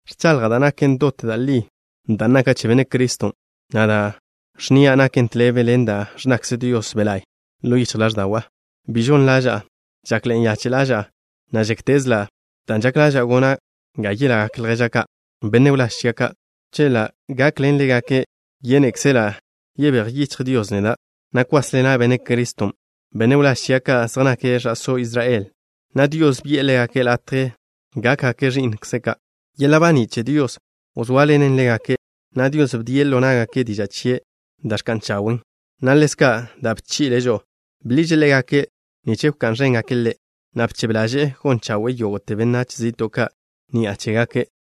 Ẕchaḻja' da' naken dot da' li dan' naka' che Benne' Criston', na' da' ẕnnia' naken tḻebe ḻen da' ẕnnakze Dios Be' La'y ḻo yichj ḻáẕda'wa'. Bi žon ḻaža'a. Žakḻe'e nyache' ḻaža'a, na' žéktezela', dan' žak ḻaža'a gona' ga yelagak lježa' ka', benne' wláž chia' ka'. Chela' gakḻen ḻégake', yénekzela' yebéj yichj Dios neda', na' kwásḻena' Benne' Criston'. Benne' wláž chia' ka' zej nake' ẕa'só Israel, na' Dios bi'e ḻégake' latje gákgake' ẕi'nkze' ka'. Yeḻa' baní' che Dios wzóaḻenen ḻégake', na' Dios bdie' ḻo ná'gake' diža' chie' da' ẕka'n chawen', na' ḻezka' da' bchi'le' žo'o. Bḻiže' ḻégake' nich wká'n ẕéngake' Ḻe', na' bchebe ḻaže'e gon chawe'e yógo'te benách zi'to' ka' ni'a chégake'.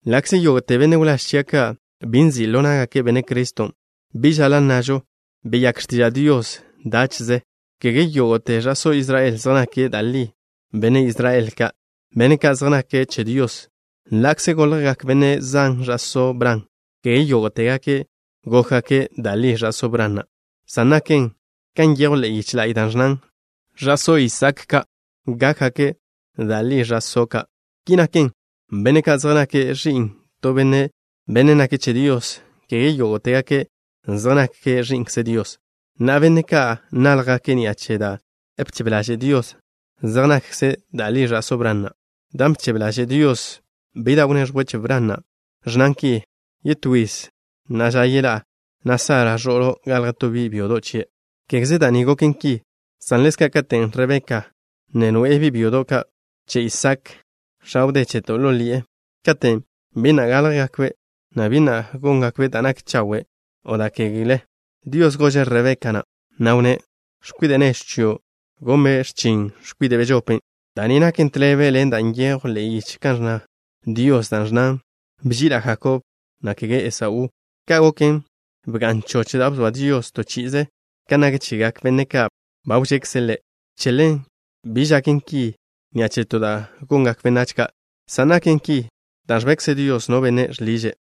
Ḻa'kze yógo'te benne' wláž chia' ka' bi nzi' ḻo ná'gake' Benne' Criston', bi žaḻa' nnažo: “Beyák x̱tiža' Dios dáche'ze.” Kege yógo'te ẕa'só Israel zej nake' da' li benne' Israel ka', benne' ka' zej nake' che Dios. Ḻa'kze goljgak benne' zan ẕa'só Bran, kege yógo'tegake' gókgake' da' li ẕa'só Bran na', san naken kan nyejw ḻe'e yiche la'y da' ẕnnan: “Ẕa'só Isaak ka' gákgakze' da' li ẕa'só' ka'.” Ki naken, benne' ka' zej nake' ẕi'n to benne', bennen' nake' che Dios, kege yógo'tegake' zej nake' ẕi'nkze Dios. Na'a, benne' ka' náljgake' ni'a che da' bchebe ḻaže' Dios zej nakze' da' li ẕa'só Bran na'. Dan' bchebe ḻaže' Dios bi da' wneẕjwe' che Bran na' ẕnnan ki: “Yetó yiz na'a ža yeḻá'a, na' Sara, ẕo'lo', galje to bi' byodo' chie'.” Kégeze da' ni goken ki, san ḻezka' katen' Rebeka ne noe'e bi' byodo' ka' che Isaak, x̱a wdé cheto', ḻo ḻi'e, katen' bi na' gáljgakbe', na' bi na' góngakbe' da' nak chawe' o da' kegle, Dios gože' Rebeka na', na' wnné': “X̱kwide' nežw chio' gonbe' x̱chin x̱kwide' bežopen'.” Da' ni naken tḻebe ḻen da' nyejw ḻe'e yiche kan wnná Dios, dan' ẕnnan: “Bži'ila' Jakob, na' kege Esaú.” Ka' goken, bga'n choch da' bzoa Dios to chi'ize kan nak chegak benne' ka' ba wžekze' Ḻe'. Che ḻen bi žaken ki ni'a che to da' gak gongak benách ka', san naken ki dan' ẕbekze Dios no benne' žḻiže'.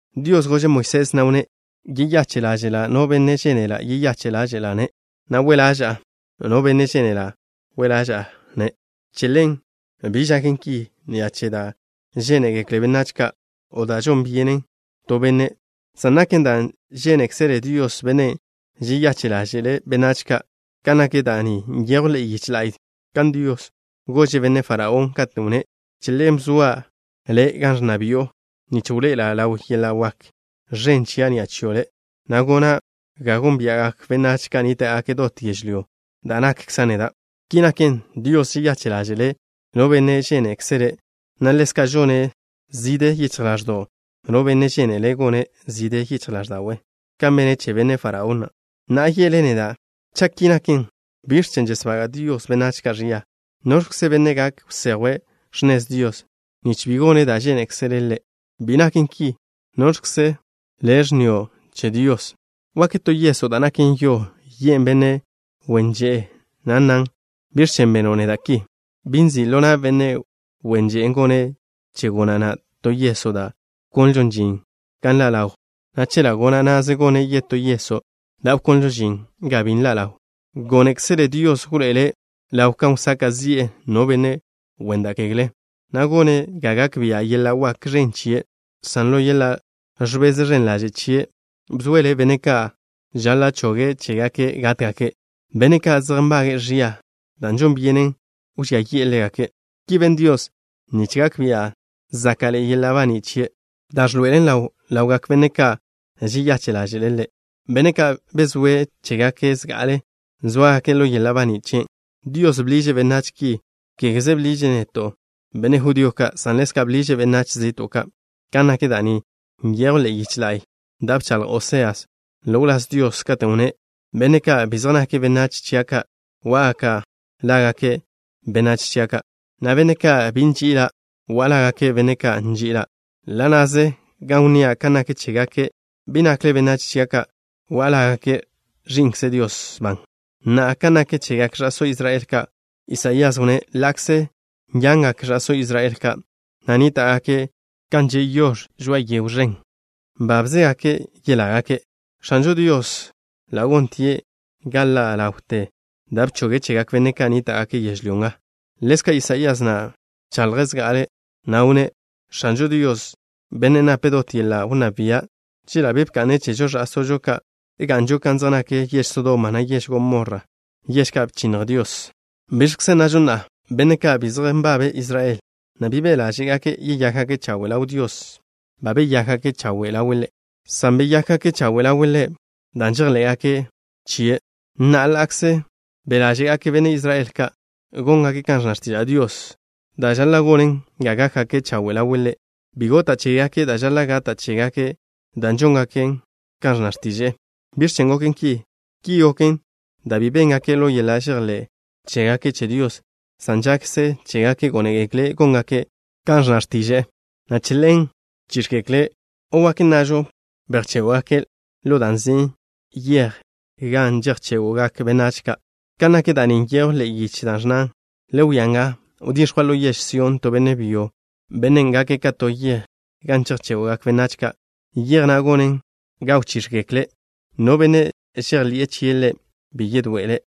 Dios gože' Moisés, na' wnné': “Yeyache' ḻáže'la' no benne' žénela' yeyache' ḻáže'la'-ne', na' we' ḻaža'a no benne' žénela' we' ḻaža'a-ne'.” Che ḻen, bi žaken ki ni'a che da' žénegekle benách ka', o dan' žon byene to benne', san naken dan' žénekzele Dios, Bennen' žeyache' ḻáže'le' benách ka'. Kan nak da' ni nyejw ḻe'e yiche la'y kan Dios gože' Benne' Faraón, katen' wnné': “Che ḻen bzoa' le' gan ẕnna bi'o nich wḻoe'ela' ḻaw yeḻa' wak ẕen chia' ni'a chio' le', na' gona' ga gónbia'gak benách ka' nníta'gake' dot yežlyó da' nakkza' neda'.” Ki naken, Dios žeyache' ḻáže'le' no benne' žénekzele', na' ḻezka' žone' zižje yichj ḻáẕdo'w no benne' žénele' gone' zižje yichj ḻáẕda'we', kan bene' che Benne' Faraón na'. Na'a ye'le neda': “Cha' ki naken, ¿biẕ chen' žesbaga' Dios benách ka' ẕia? ¿Noẕkze benne' gak wsejwe' x̱nez Dios nich bi gone' da' žénekzele' Ḻe'?” Bi naken ki. ¿Noẕkze le' ẕnnio' che Dios? ¿Wak to yeso' da' naken yo yen' benne' wen že'e, na' nnan: “¿Biẕ chen' beno' neda' ki?” ¿Bi nzi' ḻo na' benne' wen že'e gone' che gona' na' to yeso' da' wkonlžon žin ga nḻa' ḻaw, na' che ḻa' gona' na'ze gone' yetó yeso' da' wkonlžon žin ga bi nḻa' ḻaw? Gónekzele Dios wḻoe'ele' ḻaw kan wsaka' zi'e no benne' wen da' kegle, na' gone' ga gak bia' yeḻa' wak ẕen chie', san ḻo yeḻa' ẕbez ẕen ḻaže' chie' bzoele' benne' ka' žaḻa' choge' chégake' gátgake', benne' ka' zej nbage'e ẕia, da' žon byenen wžía yi'e ḻégake'. Ki ben Dios nich gak bia' záka'ḻe'e yeḻa' baní' chie', dan' ẕḻoe'ele' ḻaw ḻawgak benne' ka' žeyache' ḻáže'le', benne' ka' bzoe' chégake' zga'ale sóagake' ḻo yeḻa' baní' chien'. Dios bḻiže' benách ki. Kégeze bḻiže' neto', benne' judío ka', san ḻezka' bḻiže' benách zi'to' ka'. Kan nak da' ni nyejw ḻe'e yiche la'y da' bchaḻj Oseas ḻo wláz Dios, katen' wnné': Benne' ka' bi zej nake' benách chia' ka', go'a lágake': “Benách chia' ka'.” Na' benne' ka' bi bži'ila', go'a lágake': “Benne' ka' nži'ila'.” Ḻa' na'ze gan wnnía' kan nak chégake': “Bi nakle benách chia' ka'” go'a lágake': “Ẕi'nkze Dios ban.” Na'a, kan nak chegak ẕa'só Israel ka', Isaías wnné': Ḻa'kze yangak ẕa'só Israel ka', na' nníta'gake' kan že' yox̱ žoa'a to yego ẕen, nbábzegake' yelágake'. X̱anžo Dios ḻa' gontie' ga ḻa' ḻawte da' bchoge' chegak benách ka' nníta'gake' yežlyó nga. Ḻezka' Isaías na' bchaḻje' zga'ale, na' wnné': X̱anžo Dios, Bennen' nape' dot yeḻa' wnná bia', chela' bi bka'ne' chežo ẕa'sóžo ka', ga'nžo kan zej nak yež Sodoma, na' yež Gomorra, yež ka' bchinnj Dios. ¿Biẕkze nnažo na'a? Benne' ka' bi zej nbabe' Israel, na' bi be' ḻáže'gake' yeyákgake' chawe' ḻaw Dios, ba beyákgake' chawe' ḻawe' Ḻe', san beyákgake' chawe' ḻawe' Ḻe' dan' žejḻé'gake' chie'. Na'a, ḻa'kze be' ḻáže'gak benne' Israel ka' góngake' kan ẕnna x̱tiža' Dios, da' žaḻa' gonen ga gákgake' chawe' ḻawe' Ḻe', bi gota' chégake' da' žaḻa' gata' chégake' dan' žóngake' kan ẕnna x̱tiže'e. ¿Biẕ chen' goken ki? Ki goken dan' bi béngaken' ḻo yeḻa' žejḻé' chégake' che Dios, san žakze chégake' gónegekle' góngake' kan ẕnna x̱tiže'e, na' che ḻen bchíx̱gekle', o wak nnažo: bejchégwgake' ḻo da' nzin': Yej Gan Žejchégo'gak Benách Ka'. Kan nak da' ni nyejw ḻe'e yiche la'y da' ẕnnan: Le wia nga, wdix̱jwa' ḻo yež Sión to benne' byo, bennen' gake' ka to yej gan chejchégo'gak benách ka', yej na' gonen ga wchíx̱gekle'. No benne' chejḻi'e chie' Ḻe', bi yedoe'ele'.